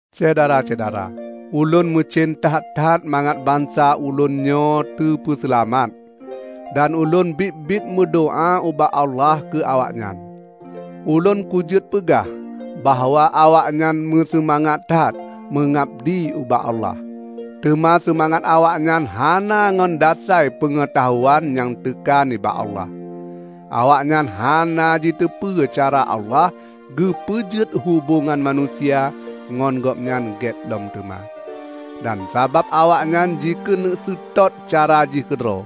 Syedara-syedara! Ulôn meucen that-that mangat bansa ulôn nyoe teupeuseulamat. Dan ulôn biet-biet meudoá ubak Allah keu awaknyan. Ulôn kujeuet peugah bahwa awaknyan meuseumangat that meungabdi ubak Allah. Teuma seumangat awaknyan hana ngon dasai peungeutahuan nyang teuka nibak Allah. Awaknyan hana jiteupeue cara Allah geupeujeuet hubongan manusia ngon Gobnyan gét lom teuma. Dan sabab awaknyan jikeuneuk seutôt cara jih keudroe,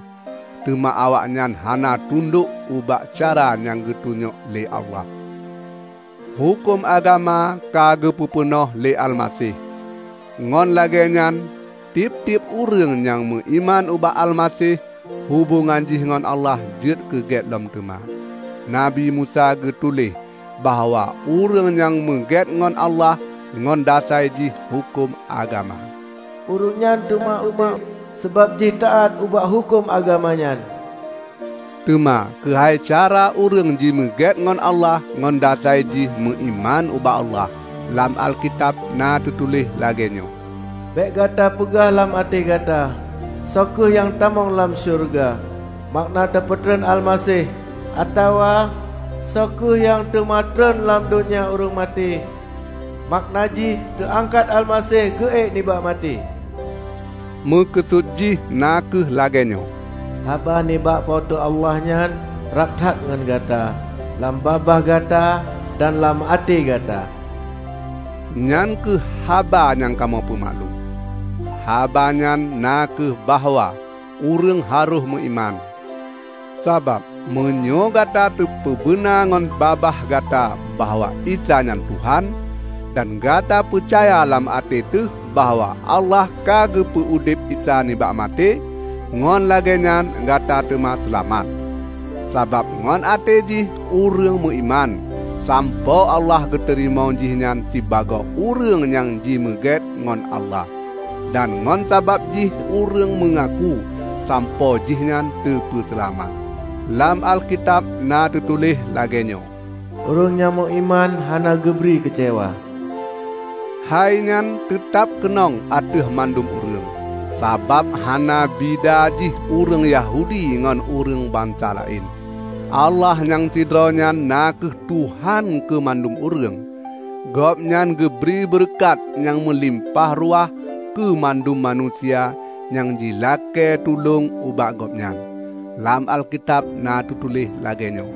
teuma awaknyan hana tundok ubak cara nyang geutunyok lé Allah. Huköm agama ka geupeu peunoh lé Almaseh. Ngon lagée nyan tieb-tieb ureuëng nyang meuiman ubak Almaseh, hubongan jih ngon Allah jeuet keu gét lom teuma. Nabi Musa geutuléh bahwa ureuëng nyang meugét ngon Allah ngon dasai jih huköm agama, ureuëng nyan teuma udeb sabab jih taát ubak huköm agama nyan. Teuma keuhai cara ureuëng jimeugét ngon Allah ngon dasai jih meuiman ubak Allah, lam Alkitab na teutuléh lagée nyoe, "Bék gata peugah lam até gata, 'Soe kheueh nyang tamong lam syeuruga?' (makna teupeutreun Almaseh), atawa, 'Soe kheueh nyang teuma treun lam donya ureuëng maté?' (makna jih teuangkat Almaseh geuék nibak maté)." Meukeusut jih na kheueh lagée nyoe, "Haba nibak Po teu Allah nyan rab that ngon gata; lam babah gata dan lam até gata." Nyan kheueh haba nyang kamoe peumaklum; haba nyan na kheueh bahwa ureuëng harôh meuiman. Sabab meunyoe Gata tapeubeuna ngon babah gata bahwa "Isa nyan Tuhan", dan Gata peucaya lam até teuh bahwa Allah ka geupeu udeb Isa nibak maté, ngon lagée nyan Gata teuma seulamat. Sabab ngon até jih ureuëng meuiman, sampoe Allah geuteurimong jihnyan sibagoe ureuëng nyang jimeugét ngon Allah. Dan ngon babah jih ureuëng meungaku, sampoe jihnyan teupeuseulamat. Lam Alkitab na teutuléh lagée nyoe, "Ureuëng nyang meuiman hana geubri keucewa." Hainyan teutab keunong ateueh mandum ureuëng, sabab hana bida jih ureuëng Yahudi ngon ureuëng bansa laén. Allah nyang sidroe nyan na kheueh Tuhan keu mandum ureuëng. Gobnyan geubri beureukat nyang meulimpah ruah keu mandum manusia nyang jilakée tulông ubak Gobnyan. Lam Alkitab na teutuléh lagée nyoe,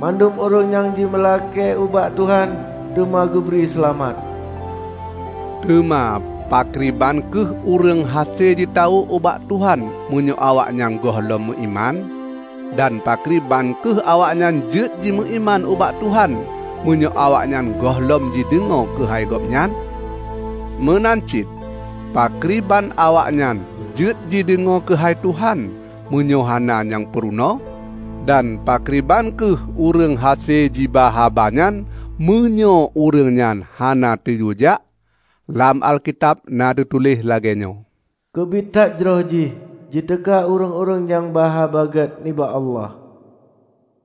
"Mandum ureuëng nyang jimeulakée ubak Tuhan, teuma geubri seulamat." Teuma pakriban kheueh ureuëng hase jitawök ubak Tuhan meunyoe awaknyan gohlom meuiman? Dan pakriban kheueh awaknyan jeuet jimeuiman ubak Tuhan, meunyoe awaknyan gohlom jideungoe keuhai Gobnyan? Meunan cit, pakriban awaknyan jeuet jideungoe keuhai Tuhan, meunyoe hana nyang peurunoe? Dan pakriban kheueh ureuëng hase jiba haba nyan meunyoe ureuëng nyan hana teuyue jak? Lam Alkitab na teutuléh lagée nyoe, "Keubit that jroh jih jiteuka ureuëng-ureuëng nyang ba Haba Gét nibak Allah!"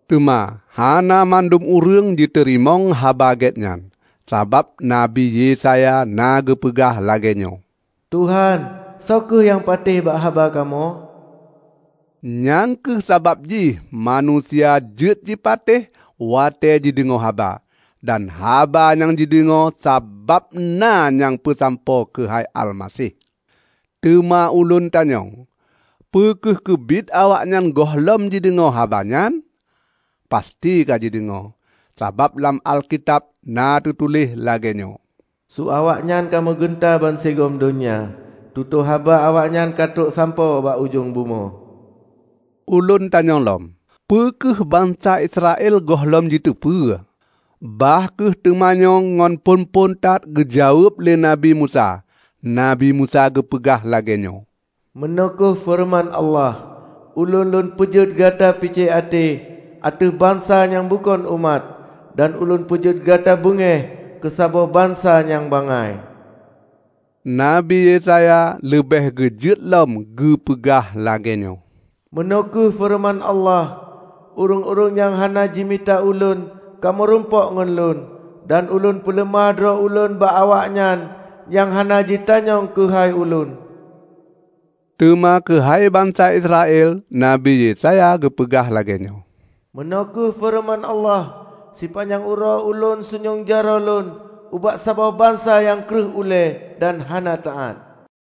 Teuma hana mandum ureuëng jiteurimong Haba Gét nyan. Sabab Nabi Yesaya na geupeugah lagée nyoe, "Tuhan, soe kheueh nyang patéh bak haba kamoe?" Nyang kheueh sabab jih manusia jeuet jipatéh watée jideungoe haba, dan haba nyang jideungoe sabab na nyang peusampoe keuhai Almaseh. Teuma ulôn tanyong: Peu kheueh keubiet awaknyan gohlom jideungoe haba nyan? Pasti ka jideungoe! Sabab lam Alkitab na teutuléh lagée nyoe, "Su awaknyan ka meugeunta bansigom donya, tutoe haba awaknyan ka trok sampoe bak ujong bumoe." Ulôn tanyong lom: Peu kheueh bansa Israel gohlom jiteupeue? Bah kheueh teumanyong nyan phon-phon that geujaweueb lé Nabi Musa, Nabi Musa geupeugah lagée nyoe, "Meunoe kheueh feureuman Allah, 'Ulôn Lôn peujeuet gata picék até ateueh bansa nyang bukon umat dan Ulôn peujeuet gata beungéh keu saboh bansa nyang bangai.' " Nabi Yesaya leubeh geujeuet lom geupeugah lagée nyoe, "Meunoe kheueh feureuman Allah, 'Ureuëng-ureuëng nyang hana jimita Ulôn ka meurumpok ngon Lôn; dan Ulôn peuleumah droe Ulôn bak awaknyan nyang hana jitanyong keuhai Ulôn.' " Teuma keuhai bansa Israel Nabi Yesaya geupeugah lagée nyoe, "Meunoe kheueh feureuman Allah, 'Sipanyang uroe Ulôn sunyueng jaroe Lôn ubak saboh bansa nyang kreueh ulée dan hana taát.' "